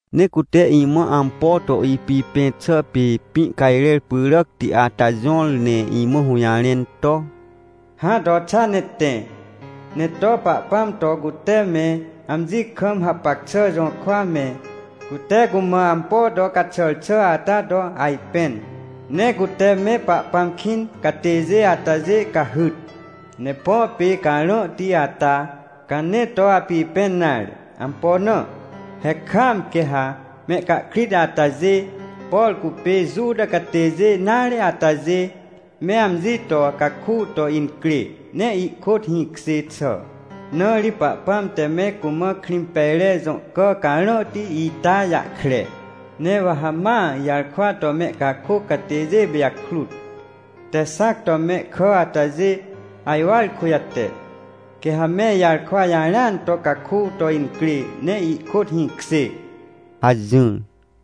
Ne cute imã ampo to ipipẽn xà pê pĩ cajrer pyràcti ata jõr, ne imã hũjarẽn to: — Hã, to xa ne tẽ, ne to Pahpãm to cute me amji kam hapac xà jũrkwa me, cute cumã ampo to caxàr xà ata to ajpẽn, ne cute me Pahpãm kĩn catêjê atajê cahyt. Ne põ pê carãhti ata, ca nee to apipẽn nare. Ampo na? He kaam quê ha mehcahkrit atajê, por cupê Juta catêjê nare atajê me amji to caku to incrê ne ihkôt hĩkjê xà, na ri Pahpãm te me cumã Krĩmpejre jõ cà carãhti ita jahkre. Ne wa ha ma ijarkwa to mehcakôc catêjê pijakrut te xãc to mehkà atajê ajwar kujate, quê ha me ijarkwa jarẽan to caku to incrê ne ihkôt hĩkjê — hajỹr.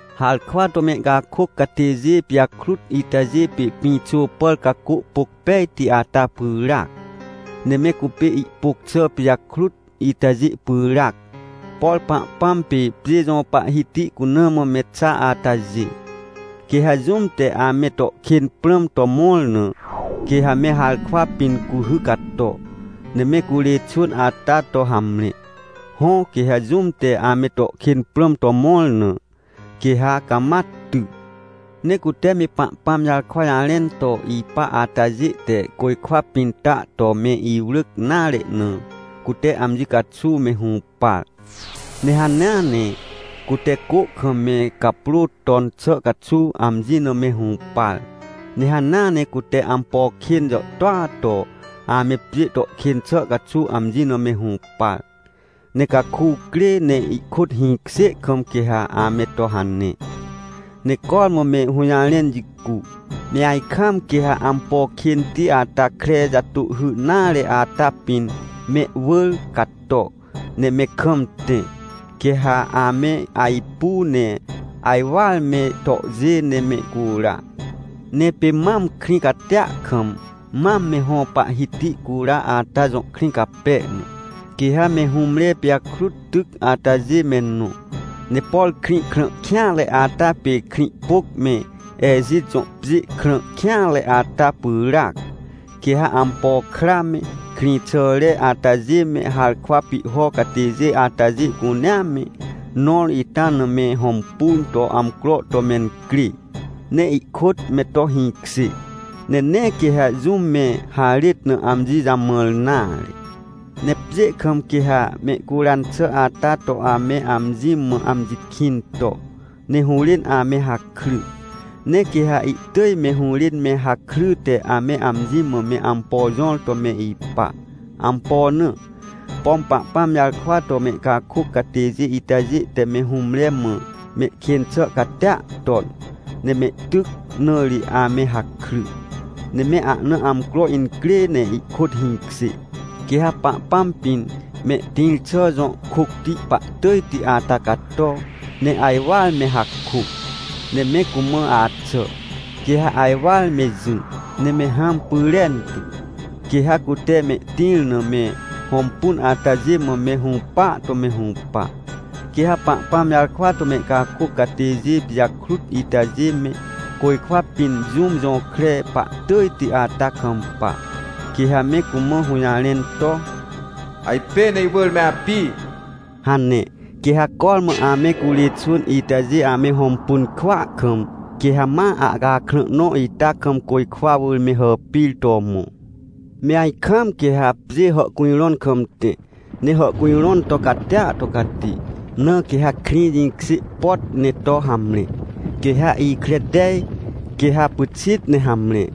Harkwa to mehcakôc catêjê pijakrut itajê pê pĩxô pàr cacô pôc pejti ata pyràac, ne me cupê ihpôc xà pijakrut itajê pyràac, por Pahpãm pê pjê jõ Pahhiti cuna mã me xa atajê. Quê ha jũm te ame to kên prãm to mõr na, quê ha me harkwa pĩn cuhy cato, ne me curê xwỳn ata to hamre. Hõ, quê ha jũm te ame to kên prãm to mõr na, quê ha cama ty. Ne cute me Pahpãm jarkwa jarẽn to ipa atajê te côjkwa pĩn ta to me iwrỳc nare na, cute amji caxuw me hũpar. Ne hanea ne cute cô kam me caprô ton xà caxuw amji na me hũpar. Ne hanea ne cute ampo kên jàhtôa to ame pjê to kên xà caxuw amji na me hũpar. Ne caku crê ne ihkôt hĩkjê kam quê ha ame to hane, ne cormã me hũjarẽn jicu, me ajkam quê ha ampo kênti ata kre jatôhhy nare ata pĩn mehwỳr cato, ne me kam tẽ. Quê ha ame ajpu ne ajwar me tohjê ne mehcura. Ne pê mam krĩ catia kam, mam me hõ Pahhiti cura ata jõ krĩ cape na, quê ha me hũmre pijakrut tyc atajê me nõ. Ne por krĩ krã kêanre ata pê Krĩhpôc me Ejit jõ pjê krã kêanre ata pyràac. Quê ha ampo kra me, krĩxàre atajê me harkwa pihho catêjê atajê cunea me nõr ita na me hõmpun to amcro to mencrê ne ihkôt me to hĩkjê. Ne nee quê ha jũm me harêt na amji jamãr nare. Ne pjê kam quê ha mehcuran xà ata to ame amji mã amji kĩn to, ne hũrên ame hakry. Ne quê ha ihtỳj me hũrên me hakryte ame amji mã me ampo jõr to me ipa. Ampo na? Pom Pahpãm jarkwa to mehcakôc catêjê itajê te me hũmre mã mehkên xà catia ton, ne mehtyc, na ri ame hakry. Ne me ahna amcro incrê ne ihkôt hĩkjê, quê ha Pahpãm pĩn mehtĩr xà jõ kôcti pahtỳjti ata cato, ne ajwar me hakô, ne me cumã axà, quê ha ajwar me jỹ ne me hãm pyrentu. Quê ha cute mehtĩr na me hõmpun atajê mã me hũpa to me hũpa. Quê ha Pahpãm jarkwa to mehcakôc catêjê pijakrut itajê me côjkwa pĩn jũm jõkre pahtỳjti ata kampa, quê ha me cumã hũjarẽn to: — Ajpên iwỳr me api! — hane. Quê ha cormã ame curê xwỳn itajê ame hõmpun kwỳa kam, quê ha ma ahcakrã nõ ita kam côjkwa wỳr me hàpir to mõ. Me ajkaam quê ha pjê hàhcujrõn kam tẽ, ne hàhcujrõn to catia to cati. Na quê ha krĩ jĩkjê pot ne to hamre. Quê ha ikre tej, quê ha pyxit ne hamre.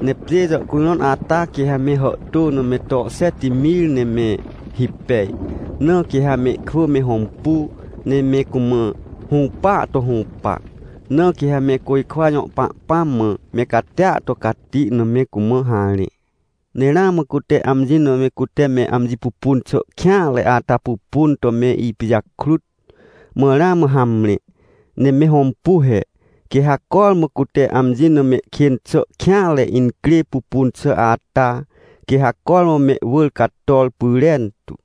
Ne pjê jàhcujrõn ata quê ha me hàhtô na me to xet mir ne me hipej. Na quê ha mehkwỳ me hõmpu, ne me cumã hũpaa to hũpa. Na quê ha me côjkwa jõ Pahpãm mã me catia to cati na, me cumã harẽ. Ne ramã cute amji na me cute me amji pupun xà kêanre ata pupun to me ipijakrut, mã ramã hamre. Ne me hõmpu he, quê ha cormã cute amji na mehkên xà kêanre incrê pupun xà ata, quê ha cormã mehwỳr cator pyrentu.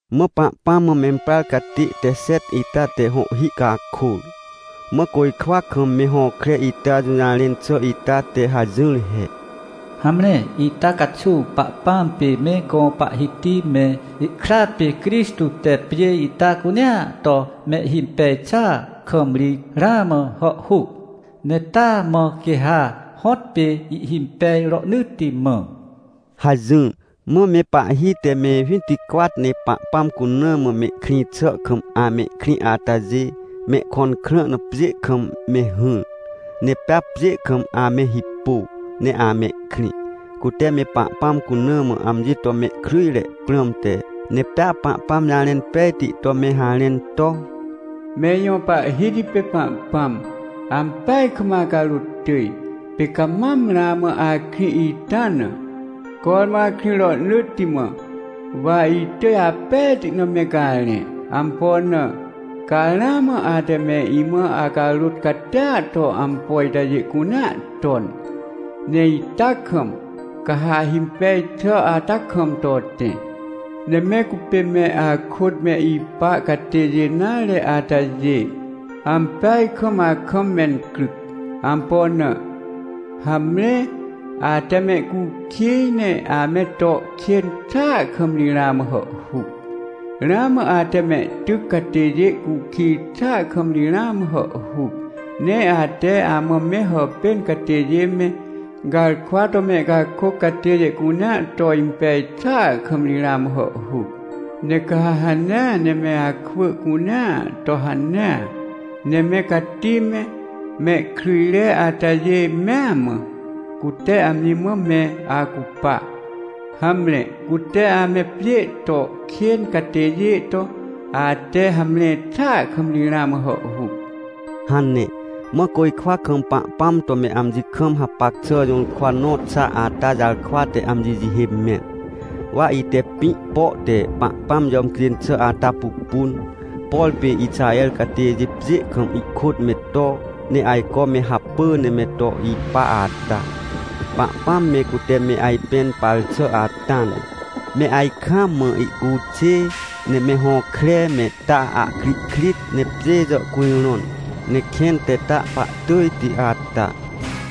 Mã Pahpãm mã memprar catê te xet ita te hõhhi cakôr, mã côjkwa kam me hõkre ita jũjarẽn xà ita te hajỹr he: — Hamre, ita caxuw Pahpãm pê me gõ Pahhiti me, ihkra pê Crixtô te pjê ita cunea to mehhimpej xàa kam ri ramã hàhhuc, ne taa mã quê ha hõtpê ihhimpej rohnỳtti mã — hajỹr. Mã me pahhi te me winticwat ne Pahpãm cuna mã mehkrĩ xà kam amehkrĩ atajê, mehkõn krã na pjê kam me hỹr, ne pea pjê kam ame hipô, ne ame krĩ, cute me Pahpãm cuna mã amji to mehkryjre prãmte ne pea Pahpãm jarẽn pejti to me harẽn to: “Me ijõ Pahhiti pê Pahpãm, ampeaj kam acarôt tỳj, pê ca mam ramã akrĩ ita na, cormã akrĩ rohnỳtti mã! Wa itỳj apejti na me garẽ. Ampo na? Ca ramã ate me imã acarôt catia to ampo itajê cunea ton, ne ita kam ca ha ahimpej xà ata kam to tẽ. Ne me cupê me akôt me ipa catêjê nare atajê, ampeaj kam akam mencryc. Ampo na? Hamre, ate mehcukij ne ame to kên xàa kam ri ramã hàhhuc. Ramã ate mehtyc catêjê cukij xàa kam ri ramã hàhhuc. Ne ate amã me hàpên catêjê me, garkwa to mehcakôc catêjê cunea to impej xàa kam ri ramã hàhhuc. Ne ca ha hanea ne me akwỳ cunea to hanea, ne me cati me, mehkryjre atajê mea mã, cute amji mã me acupa. Hamre, cute ame pjê to kên catêjê to, ate hamre xàa kam ri ramã hàhhuc!” hane. Mã côjkwa kam Pahpãm to me amji kam hapac xà jũrkwa nõ xa ata jarkwa te amji jihê mẽn. Wa ite pĩ po te Pahpãm jàmcjên xà ata pupun, por pê Ixaher catêjê pjê kam ihkôt me to, ne ajco me hapỳ ne me to ipa ata, Pahpãm me cute me ajpẽn par xà ata na. Me ajkaam mã ihcuxê, ne me hõkre, me ta ahkrihkrit, ne pjê jàhcujrõn, ne kẽn te ta pahtỳjti ata.